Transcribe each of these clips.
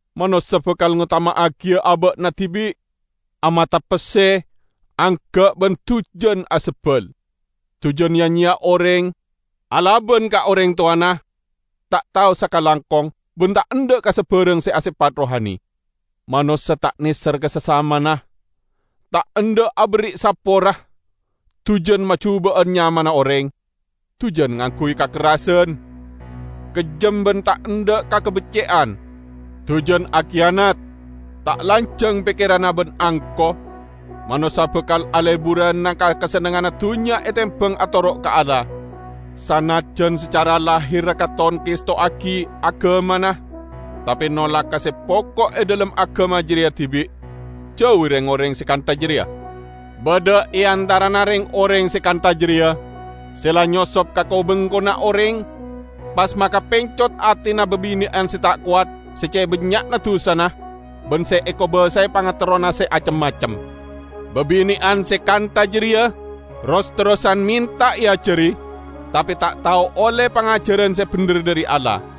Manossa bakal ngotama'agiya aba'na dibi', amata pesse, angga' ban dujan asebbal. Dujan ya-nyeya oreng, alaban ka oreng towana, ta' tao sakalangkong ban ta' endha' ka sabarang se asepat rohani. Manossa ta' neser ka sasamana, ta' endha' aberri' sapora, dujan majuba'an nyamana oreng, dujan ngangguy kakerrasan, kejjem ban ta' endha' ka kabecce'an. Dujan akiyanat, ta' lanjang pekkeranna ban angko; manossa bakal aleburana ka kasennengnganna dunnya etembang atoro' ka Allah. Sanajjan sacara lahirra katon ngestowagi agamana, tape nolak ka se poko' e dhalem agama jareya dibi'. Jauwi reng-oreng se kantha jareya. Badha e antarana reng-oreng se kantha jareya se la nyosop ka ko-bengkona oreng, pas makapencot atena babine'an se ta' kowat se ce' bannya'na dusana ban se ekobasae pangaterrona se acem-macem. Babine'an se kantha jareya ros-terrosan menta eajari, tape ta' tao olle pangajaran se bendher dhari Allah.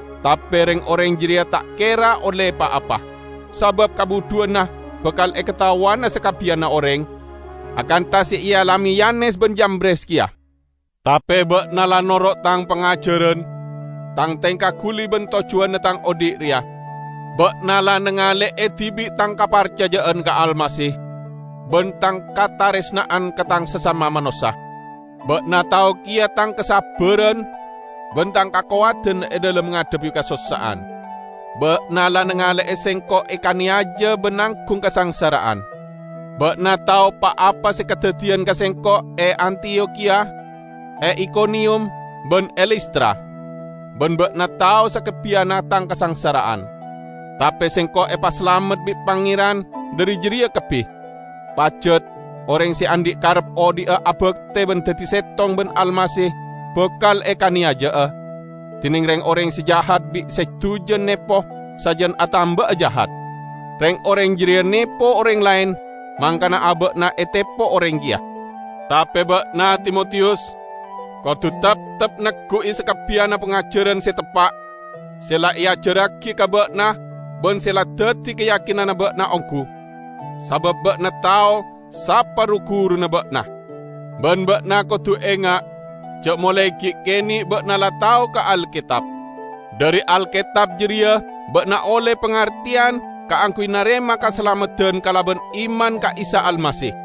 Tape reng-oreng jareya ta' kera olle pa-apa, sabab kabudhuwanna bakal ekataowana sakabbiyanna oreng, akantha se ealame Yanes ban Yambres keya. Tape ba'na la noro' tang pangajaran, tang tengka guli ban tojjuwanna tang odhi' reya. Ba'na la nangale'e dibi' tang kaparcaja'an ka Almasih ban tang kataresna'an ka tang sasama manossa. Ba'na tao keya tang kasabbaran ban tang kakowadan e dhalem ngadhebbi kasossa'an. Ba'na la nangale'e sengko' ekaneyaja ban nanggung kasangsara'an. Ba'na tao pa-apa se kadaddiyan ka sengko' e Antiyokhiya, e Ikoniyum ban e Listra; ban ba'na tao sakabbiyanna tang kasangsara'an. Tape sengko' epasalamet bi' Pangeran dhari jareya kabbi. Pajat, oreng se andhi' karep odhi'a abakte ban daddi settong ban Almasih bakal ekaneyaja'a, dineng reng-oreng se jahat ban se dujan nepo sajan atamba'a jahat. Reng-oreng jareya nepo oreng laen, mangkana aba'na etepo oreng keya. Tape ba'na, Timotiyus, kodu teptep neggu'i sakabbiyanna pangajaran se teppa' se la eajarragi ka ba'na ban se la daddi kayakinanna ba'na onggu; sabab ba'na tao sapa ru-guruna ba'na. Ban ba'na kodu enga' ja' molae gi' kene' ba'na la tao ka Alketab. Dhari Alketab jareya ba'na olle pangarteyan kaangguy narema kasalameddan kalaban iman ka Isa Almasih.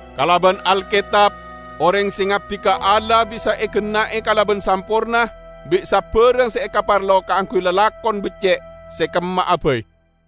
Kalaban Alketab oreng se ngabdi ka Allah bisa egenna'e kalaban samporna bi' sabarang se ekaparlo kaangguy lalakon becce' se kemma'a bai.